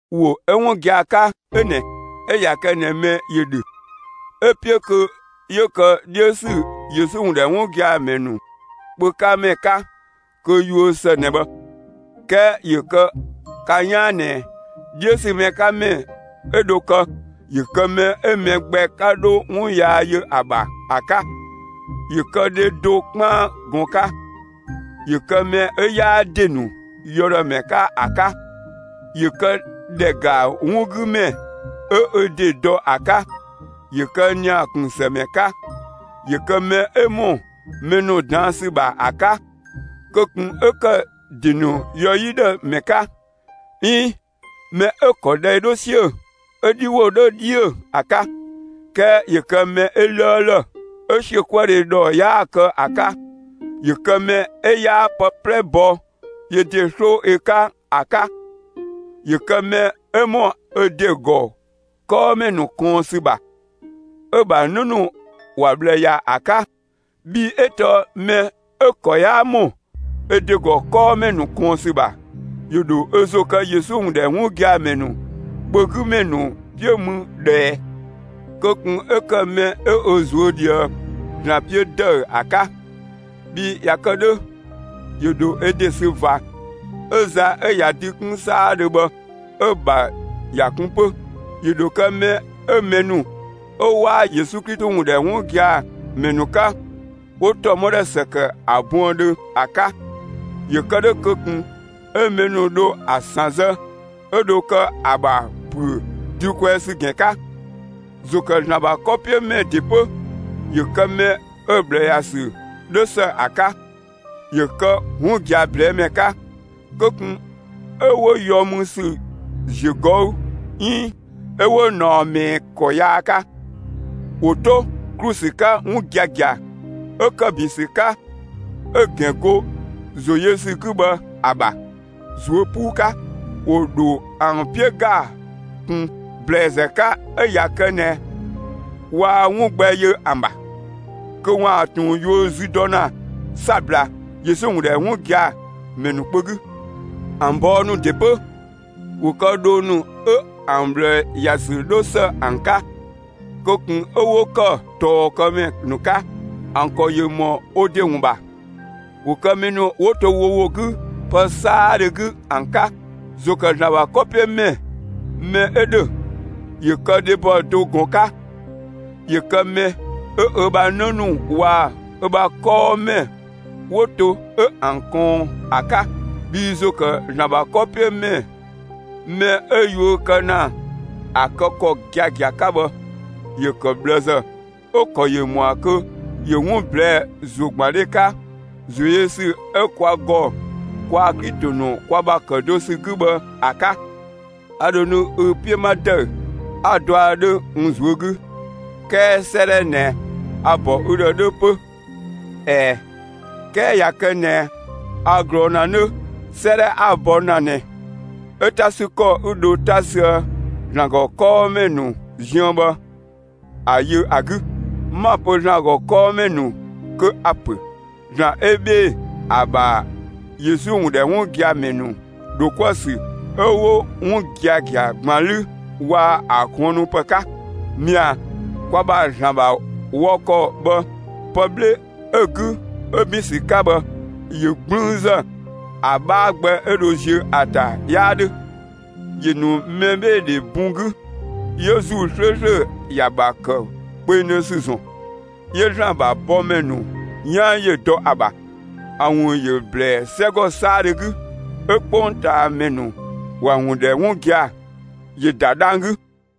‑Wo 'ö 'wun gia‑ 'ka 'ö ꞊nɛ: 'Ö ꞊ya kë ꞊nɛ mɛ ‑yö ‑dhö 'ö‑ 'piö kö 'yö kë 'dhiö ‑sü Yesu ‑wun ‑dhɛ 'wun gia‑ ‑mɛ ‑nu kpö 'ka ‑mɛ 'ka kö yuö ‑së ꞊nɛ bhë. 'Kɛɛ ‑yö kë ka 'yaan ꞊nɛ 'dhiö ‑sü mɛ 'ka ‑mɛ 'ö dho kë, ‑yö kë mɛ 'ö mɛ gbɛ 'ka 'dho 'wun yaa yö ‑a ‑bha ‑a 'ka; ‑yö kë dhe do 'kpaan ꞊gɔn 'ka; ‑yö kë mɛ 'ö 'yaa ‑de ‑nu yɔ ‑dhë ‑mɛ 'ka ‑a 'ka; ‑yö këdhɛ ‑ga 'wun 'gü ‑mɛ 'ö ö ‑de dɔ ‑a 'ka, ‑yö ‑kë ‑nia ‑kun ‑së ‑mɛ 'ka, ‑yö kë mɛ 'ö ‑mɔ mɛ ‑nu ꞊daan' ‑sü ‑bha ‑a 'ka; kö ꞊kun 'ö ‑kë ‑de ‑nu yɔ 'yi ‑dhë ‑mɛ 'ka, 'iin mɛ 'ö‑ ‑kɔ dhɛi 'dhö 'siö‑, 'ö‑ 'dhi ‑wo 'dhö 'dhiö‑ ‑a 'ka, 'kɛɛ ‑yö kë mɛ 'ö 'lëëlë, 'ö ‑siökuëdhe ‑dhɔ 'yaa‑ kë ‑a 'ka. ‑Yö kë mɛ 'ö 'yaa pë 'plɛ bɔ yö do 'sloo ö 'ka ‑a 'ka. ‑Yö kë mɛ 'ö ‑mɔ ö ‑de ‑gɔ 'kɔɔmɛ ‑nu ꞊kɔɔn ‑sü ‑bha 'ö‑ ‑bha 'në ‑nu ‑wa ꞊bhlë ‑ya ‑a 'ka. Bhii 'ö tɔɔ mɛ 'ö‑ ‑kɔ 'yaa ‑mɔ ö ‑de ‑gɔ 'kɔɔmɛ ‑nu ꞊kɔɔn ‑sü ‑bha, ‑yö ‑dho ö ‑zo kë Yesu ‑wun ‑dhɛ 'wun gia‑ ‑mɛ ‑nu kpö 'gü ‑mɛ ‑nu 'piö mü ꞊dhë ꞊ɛɛ? Kö ꞊kun 'ö ‑kë mɛ 'ö ö ꞊zuö' ꞊dhië ‑Zlan 'piö ‑dëü ‑a 'ka; bhii ꞊ya kë 'dhö ‑yö ‑dho ö ‑de sü ꞊va 'ö za 'ö ꞊ya dü 'kun 'saadhö bhë 'ö‑ ‑bha ‑ya kun 'pö. ‑Yö ‑dho kë mɛ 'ö mɛ ‑nu 'ö 'waa Yesu Klito ‑wun ‑dhɛ 'wun gia‑ ‑mɛ 'ka, 'wo ‑tɔmɔdhɛ ‑së ‑kë ‑a buëndhö ‑a 'ka, ‑yö kë 'dhö kö ꞊kun 'ö mɛ ‑nu dho ‑a ‑sanzë 'ö dho kë ‑a ‑bha ‑püö dü kwɛɛ ‑sü ‑gɛn 'ka. ‑Zo ‑kë ‑Zlan ‑bha 'kɔ 'piö ‑mɛ ‑de 'pö, ‑yö kë mɛ 'ö‑ ꞊bhlë ‑ya ‑sü 'dhö ‑së ‑a 'ka; ‑yö kë 'wun gia‑ ꞊blɛɛ'‑ ‑mɛ 'ka. Kö ꞊kun 'ö 'wo yɔ mü ‑sü ‑ziö ꞊gɔü' 'iin 'ö 'wo ꞊naɔ ꞊mɛɛ ‑kɔ yaa 'ka. ‑Wo 'to ‑klu ‑sü 'ka 'wun giagia 'ö ‑kë ‑bin ‑sü 'ka 'ö‑ ‑gɛn go ‑zo yö ‑sü 'gü bhë ‑a ‑bha, ꞊zuö' 'puu 'ka. ‑Wo ‑dho ‑an 'piö ‑ga ꞊kun ‑blɛɛzë 'ka; 'ö ꞊ya kë ꞊nɛ waa 'wun gbɛ yö ‑an ‑bha, kö ‑waan ꞊tun yuö zü dɔ ‑na 'sabla Yesu ‑wun ‑dhɛ 'wun gia‑ ‑mɛ ‑nu kpö 'gü. ‑An bɔɔ ‑nu ‑de 'pö, ‑wo kë dhoo ‑nu 'ö ‑an ꞊bhlë ‑ya ‑sü 'dho ‑së ‑an 'ka; kö ꞊kun 'ö 'wo ‑kë ꞊tɔɔkëmɛ ‑nu 'ka; ‑an ‑kɔ ‑yö ‑mɔ wo ‑de ‑wun ‑bha; ‑wo kë mɛ ‑nu 'wo to wo ‑wo 'gü pë 'saadhö 'gü ‑an 'ka. ‑Zo ‑kë ‑Zlan ‑bha 'kɔ 'piö ‑mɛ mɛ 'ö ‑dhö ‑yö kë dhebɔ do ꞊gɔn 'ka; ‑yö kë mɛ 'ö ö ‑bha 'në ‑nu waa‑ ö ‑bha 'kɔɔmɛ 'wo to 'ö ‑an ꞊kɔɔn ‑a 'ka. Bhii ‑zo ‑kë ‑Zlan ‑bha 'kɔ 'piö ‑mɛ mɛ 'ö yuö kë ‑na ‑a kë ‑kɔ giagia 'ka bhë, ‑yö ‑kë ꞊bhlëzë, 'ö‑ ‑kɔ ‑yö ‑mɔa kö ‑yö 'wun ꞊blɛɛ'‑ ‑zogbandhe 'ka ‑zoyösü 'ö kwa ‑gɔ kwaa‑ Klito ‑nu kwa ‑bha ‑kë do ‑sü 'gü bhë ‑a 'ka. A ‑dho nu ü 'piö 'ma ‑dëü, 'a‑ dɔa 'dhö n ꞊zuö' 'gü; 'kɛɛ 'sëëdhɛ ꞊nɛ a‑ ‑bɔ ü ‑dhë 'dhö 'pö. ꞊Ɛɛ, 'kɛɛ ꞊ya kë ꞊nɛ a ꞊glɔɔ ‑na 'nö, 'sëëdhɛ 'a‑ bɔ ‑na ꞊nɛ, 'ö 'ta ‑sü ‑kɔ 'ü dho 'ta süë ‑Zlan ‑gɔ 'kɔɔmɛ ‑nu ziën bhë, ‑a yö ‑a 'gü. 'Ma‑ pö ‑Zlan ‑gɔ kɔɔmɛ ‑nu kö a‑ ‑pö ‑Zlan 'ö 'bhee‑ ‑a ‑bha Yesu ‑wun ‑dhɛ 'wun gia‑ ‑mɛ ‑nu ‑dho 'kuë‑ ‑sü 'ö 'wun giagia ‑gban 'lü waa‑ ‑a kuënnupë 'ka. Mɛa‑, kwa ‑bha ‑Zlan ‑bha wɔ ‑kɔ bhë, pë 'bhle 'ö‑ 'gü 'ö ‑bin ‑sü 'ka bhë, ‑yö 'gblüünzë. ‑A 'bhaa gbɛ 'ö dho ziö ‑a ‑ta 'yaa 'dhö. ‑Yö ‑nu mɛbheedhe bun 'gü 'yö ‑Zuu 'slööslö ‑ya ‑bha ‑kë kpengdhö ‑sü ‑zɔn. 'Yö ‑Zlan ‑bha bɔmɛ ‑nu 'yan ‑yö dɔ ‑a ‑bha. ‑A ‑wun ‑yö ꞊blɛɛ'‑ 'sɛgɔ 'saadhö 'gü 'ö 'kpongtaamɛ ‑nu ‑wa ‑wun ‑dhɛ 'wun gia‑, ‑yö ‑da dhang‑ 'gü.